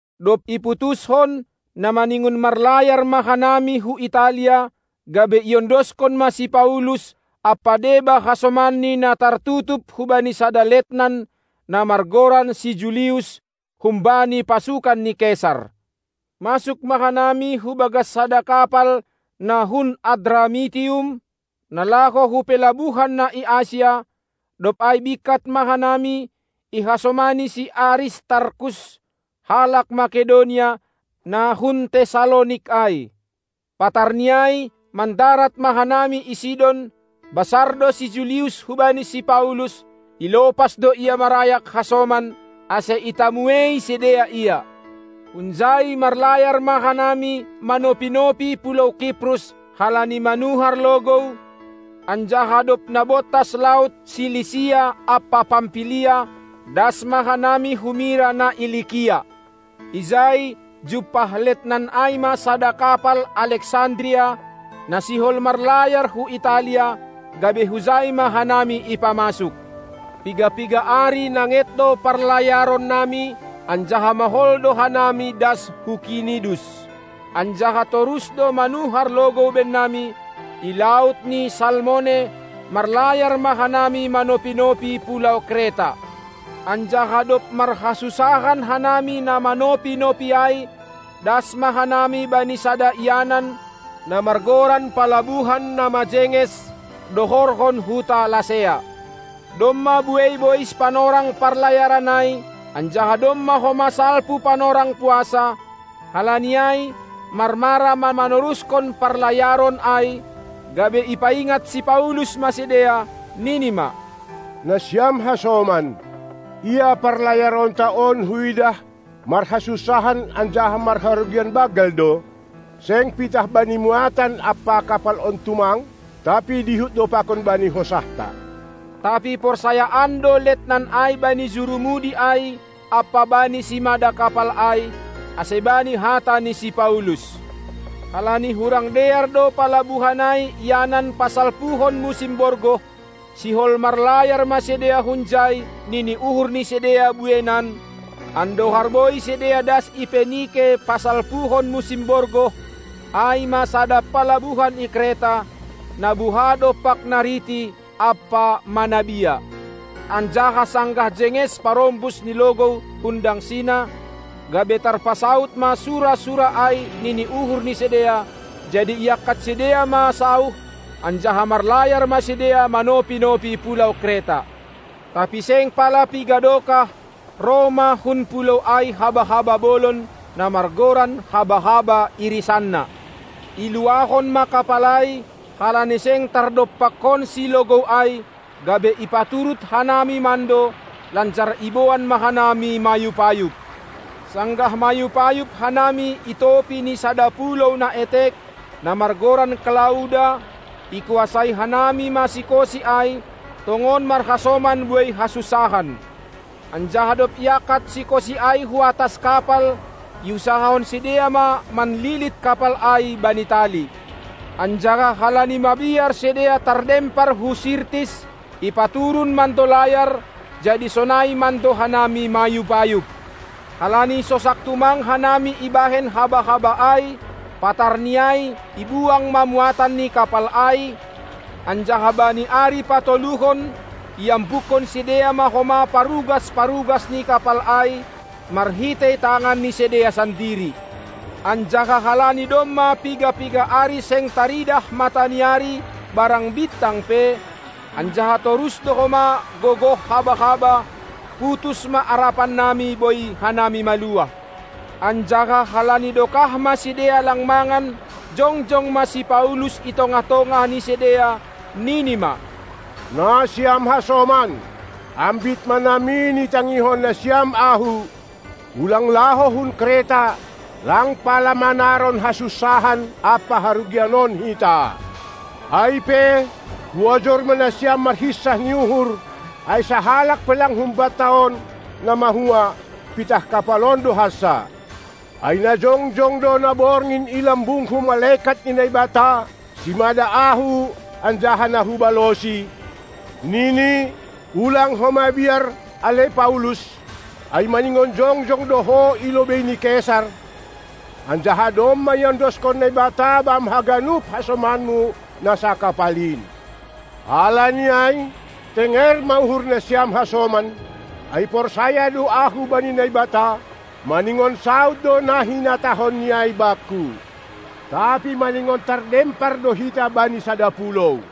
Dob iputushon, na maningon marlayar ma hanami hu Italia, gabe iondoskon ma si Paulus ampa deba hasomanni na tartutup hubani sada letnan, na margoran si Julius, humbani pasukan ni Kesar. Masuk ma hanami hubagas sada kapal na hun Adramitium, na laho hu pelabuhan na i Asia; dob ai bingkat ma hanami, ihasomani si Aristarkus, halak Makedonia, na hun Tessalonik ai. Patarni ai mandarat ma hanami i Sidon; basar do si Julius hubani si Paulus, ilopas do ia marayak hasoman, ase itamuei sidea ia. Hunjai marlayar ma hanami manopi-nopi pulou Kiprus, halani manuhar logou, anjaha dob nabontas laut ni Silisia ampa Pampilia, das ma hanami hu Mira na i Likia. Ijai jumpah letnan ai ma sada kapal Aleksandria, na sihol marlayar hu Italia, gabe hujai ma hanami ipamasuk. Piga-piga ari nanget do parlayaronnami, anjaha mahol do hanami das hu Knidus. Anjaha, torus do manuhar logou bannami; i laut ni Salmone marlayar ma hanami manopi-nopi pulou Kreta. Anjaha dob marhasunsahan hanami na manopi-nopi ai das ma hanami bani sada ianan, na margoran Palabuhan na majenges, dohorhon huta Lasea. Domma buei bois panorang parlayaron ai anjaha domma homa salpu panorang puasa, halani ai marmara ma manoruskon parlayaron ai, gabe ipaingat si Paulus ma sidea, nini ma: Nasiam hasoman, ia parlayaronta on huidah marhasunsahan anjaha marharugian banggal do, seng pitah bani muatan ampa kapal on tumang, tapi dihut do pakon bani hosahta. Tapi porsayaan do letnan ai bani jurumudi ai ampa bani simada kapal ai, ase bani hata ni si Paulus. Halani hurang dear do palabuhan ai ianan pasalpuhon musim borgoh, sihol marlayar ma sidea hunjai nini uhur ni sidea bueinan, andohar boi sidea das i Penike pasalpuhon musim borgoh, ai ma sada palabuhan i Kreta, na buha dompak nariti ampa manabia. Anjaha, sanggah jenges parombus ni logou hun dangsina gabe tarpasaud ma sura-sura ai nini uhur ni sidea, jadi iangkat sidea ma sauh, anjaha marlayar ma sidea manopi-nopi pulou Kreta. Tapi seng pala piga dokah roh ma hun pulou ai haba-haba bolon, na margoran haba-haba irisanna. Iluahon ma kapal ai; halani seng tardompakkonsi logou ai gabe ipaturut hanami mando, lanjar iboan ma hanami mayub-ayub. Sanggah mayub-ayub hanami i topi ni sada pulou na etek, na margoran Klauda, ikuasai hanami ma sikosi ai, tongon marhasonam buei hasunsahan. Anjaha dob iangkat sikosi ai huatas kapal, iusahahon sidea ma manlilit kapal ai bani tali. Anjaha halani mabiar sidea tardempar hu Sirtis, ipaturun mando layar, jadi sonai mando hanami mayub-ayub. Halani sosak tumang hanami ibahen haba-haba ai, patarni ai ibuang ma muatan ni kapal ai, anjaha bani ari patoluhon iambukkon sidea ma homa parugas-parugas ni kapal ai marhitei tangan ni sidea sandiri. Anjaha halani domma piga-piga ari seng taridah mataniari barang bintang pe, anjaha torus do homa gogoh haba-haba, putus ma arapan nami boi hanami maluah. Anjaha halani dokah ma sidea lang mangan, jongjong ma si Paulus i tongah-tongah ni sidea, nini ma: Nasiam hasoman, ambit ma namin itangihon nasiam ahu, ulang laho hun Kreta, lang pala manaron hasunsahan ampa harugian on hita! Ai pe, huojur ma nasiam marhinsah ni uhur, ai sahalak pe lang humbanta on na mahua, pitah kapal on do hansa. Ai na jongjong do na borngin i lambungku malekat ni Naibata, simada ahu anjaha na hubalosi, nini: Ulang ho mabiar, ale Paulus, ai maningon jongjong do ho ilobei ni Kesar, anjaha domma iondoskon Naibata bam haganup hasomanmu na sakapal in. Halani ai, tenger ma uhurnasiam hasoman, ai porsaya do ahu bani Naibata, maningon saud do na hinatahonni ai bakku. Tapi maningon tardempar do hita bani sada pulou.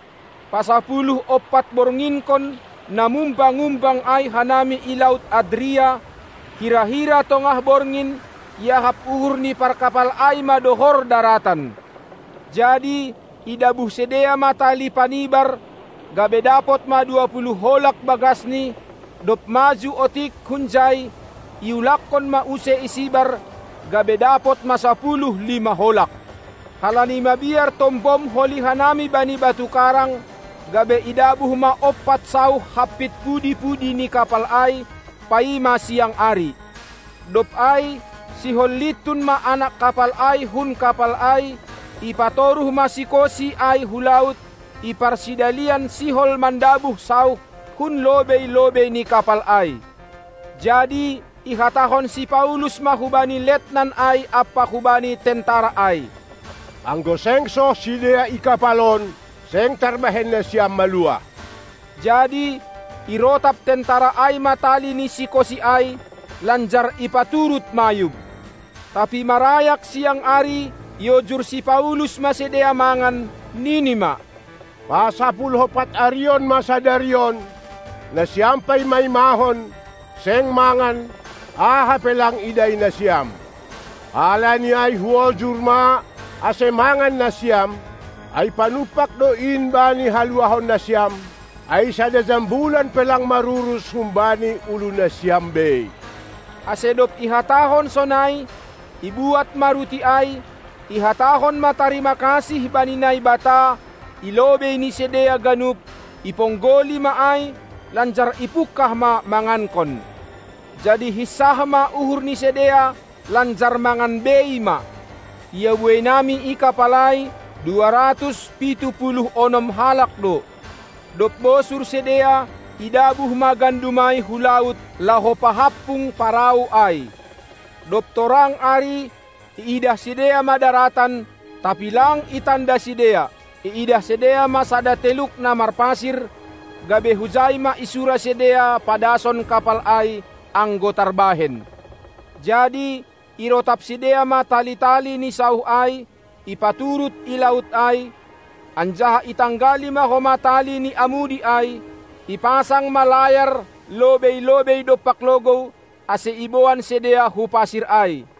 Pasapuluh-ompat-bornginkon na mumbang-umbang ai hanami i laut Adria, hira-hira tongah borngin, iahap uhur ni parkapal ai ma dohor daratan. Jadi idabuh sidea ma tali panibar, gabe dapot ma dua puluh holag bagasni; dob maju otik hunjai iulakkon ma use isibar, gabe dapot ma sapuluh lima holag. Halani mabiar tombom holi hanami bani batu karang, gabe idabuh ma ompat sauh hampit pudi-pudi ni kapal ai, paima siang ari. Dob ai sihol lintun ma anak kapal ai hun kapal ai, ipatoruh ma sikosi ai hu laut, iparsidalian sihol mandabuh sauh hun lobei-lobei ni kapal ai. Jadi ihatahon si Paulus ma hubani letnan ai ampa hubani tentara ai: Anggo seng soh sidea i kapal on, seng tarbahen nasiam maluah. Jadi irotap tentara ai ma tali ni sikosi ai, lanjar ipaturut mayub. Tapi marayak siang ari, iojur si Paulus ma sidea mangan, nini ma: Pasapuluh-ompat arihon ma sadari on, nasiam paima-imahon, seng mangan, aha pe lang idai nasiam. Halani ai huojur ma ase mangan nasiam, ai panumpak do in bani haluahonnasiam, ai sada jambulan pe lang marurus humbani ulunasiam bei. Ase dob ihatahon sonai, ibuat ma ruti ai, ihatahon ma tarimakasih bani Naibata i lobei ni sidea ganup, iponggoli ma ai, lanjar ipungkah ma mangankon. Jadi hinsah ma uhur ni sidea lanjar mangan bei ma. Ia bueinami i kapal ai, dua ratus pitu puluh onom halak do. Dob bosur sidea idabuh ma gandum ai hu laut laho pahampung parau ai. Dob torang ari, iidah sidea ma daratan, tapi lang itanda sidea. Iidah sidea ma sada teluk na marpasir, gabe hujai ma isura sidea padason kapal ai, anggo tarbahen. Jadi irotap sidea ma tali-tali ni sauh ai, ipaturut i laut ai, anjaha itanggali ma homa tali ni amudi ai; ipasang ma layar lobei-lobei dompak logou, ase iboan sidea hu pasir ai.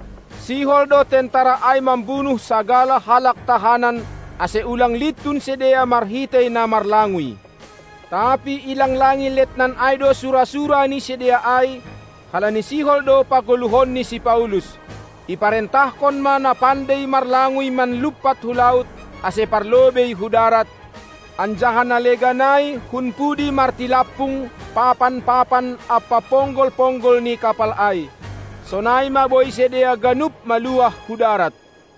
Sihol do tentara ai mambunuh sagala halak tahanan, ase ulang lintun sidea marhitei na marlanguy, tapi ilanglangi letnan ai do sura-sura ni sidea ai, halani sihol do pagoluhonni si Paulus. Iparentahkon ma na pandei marlanguy manlumpat hu laut, ase parlobei hu darat, anjaha na legan ai hun pudi martilampung papan-papan ampa ponggol-ponggol ni kapal ai. Sonai ma boi sidea ganup maluah hu darat.